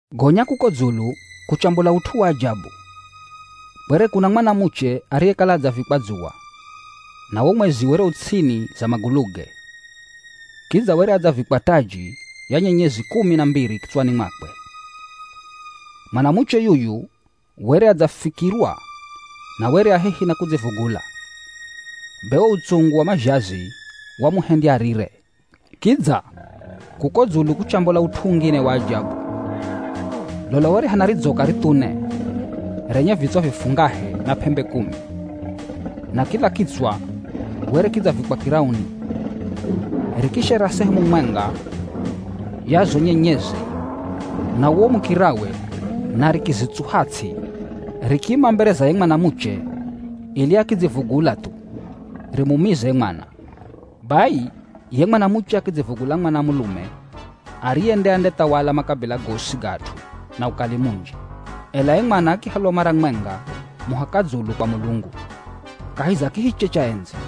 Gonya kuko dzulu kuchambola ut'u wa ajabu. Kwere kuna mwanamuche ariyekala adzavikwa dzuwa, na wo mwezi were u ts'ini za maguluge. Kidza were adzavikwa taji ya nyenyezi kumi na mbiri kitswani mwakwe. Mwanamuche yuyu were adzafikirwa na were a hehi na kudzivugula. Be wo utsungu wa mazhazi wamuhendya arire. Kidza, kuko dzulu kuchambola ut'u ungine wa ajabu. Lola were hana ridzoka rithune, renye vitswa vifungahe na p'embe kumi. Na kila kitswa were kidzavikwa kirauni. Rikishera sehemu mwenga ya zo nyenyezi na uwo mukirawe na rikizitsuha ts'i. Rikiima mbere za ye mwanamuche ili akidzivugula thu rimumize ye mwana. Bai ye mwanamuche akidzivugula mwana mulume ariye nde andethawala makabila gosi ga at'u na ukali munji. Ela ye mwana akihalwa mara mwenga muhaka dzulu kwa Mulungu, kahi za kihiche cha endzi.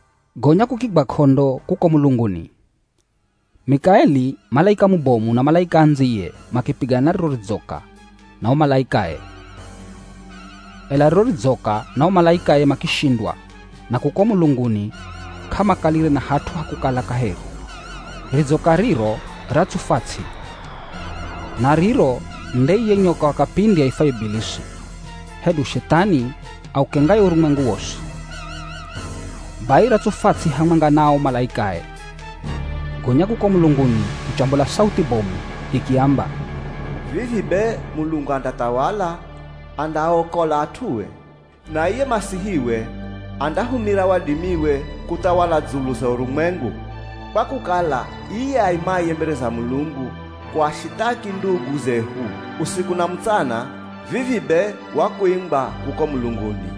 Gonya kukigwa k'ondo kuko mulunguni. Mikaeli; malaika mubomu na malaika andziye makipigana na riro ridzoka na o malaikae. Ela riro ridzoka na o malaikae makishindwa na kuko mulunguni k'amakalire na hat'u ha kukala kaheri. Ridzoka riro ratsufwa ts'i. Na riro nde iye nyoka wa kapindi aifwaye Ibilisi, hedu Shethani aukengaye urumwengu wosi. Bai ratsufwa ts'i hamwenga na o malaikae. Gonya kuko mulunguni kuchambola sauthi bomu ikiamba, “Vivi be Mulungu andathawala, andaaokola at'ue. Na iye Masihiwe andahumira wadimiwe kuthawala dzulu za urumwengu, kwa kukala iye aimaye mbere za Mulungu kuashithaki ndugu zehu usiku na mutsana vivi be wakuingwa kuko mulunguni.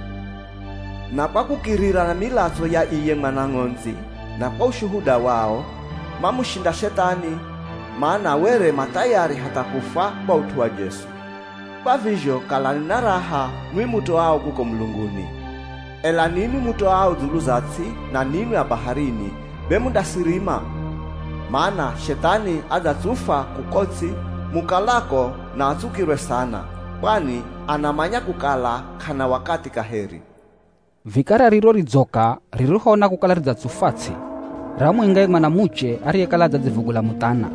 Na kwa kukirira na milatso ya iye Mwana Ng'ondzi na kwa ushuhuda wao, mamushinda Shethani, mana were ma thayari hatha kufwa kwa ut'u wa Jesu. Kwa vizho kalani na raha nwi mutoao kuko mulunguni. Ela ninwi mutoao dzulu za ts'i, na ninwi a baharini, be mundasirima. Mana Shethani adzatsufwa kuko ts'i mukalako na atsukirwe sana, kwani anamanya kukala k'ana wakathi kaheri.” Vikara riro ridzoka ririhoona kukala ridzatsufwa ts'i, ramuinga ye mwanamuche ariyekala adzadzivugula muthana.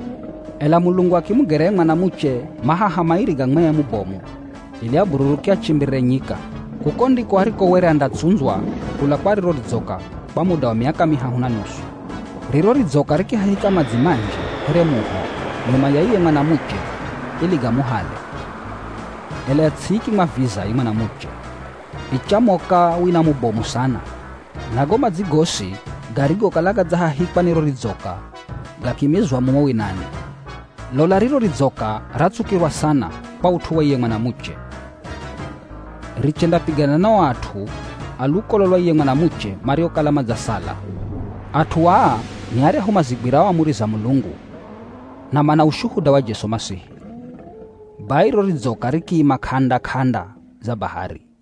Ela Mulungu akimugera ye mwanamuche mahaha mairi ga mwee mubomu ili abururuke achimbirire nyika. Kuko ndiko ariko were andatsundzwa kula kwa riro ridzoka kwa muda wa miaka mihahu na nusu. Riro ridzoka rikihahika madzi manji here muho nyuma ya iye mwanamuche ili gamuhale. Ela ts'i ikimwaviza ye mwanamuche. Ichamoka wina mubomu sana na go madzi gosi garigokala gadzahahikwa ni ro ridzoka gakimizwa mumo winani. Lola riro ridzoka ratsukirwa sana kwa ut'u wa iye mwanamuche. Richendapigana na o at'u a lukolo lwa ye mwanamuche mariokala madzasala. At'u aa ni aryahu mazigwirao amuri za Mulungu na mana ushuhuda wa Jesu Masihi. Bai riro ridzoka rikiima k'anda-k'anda za bahari.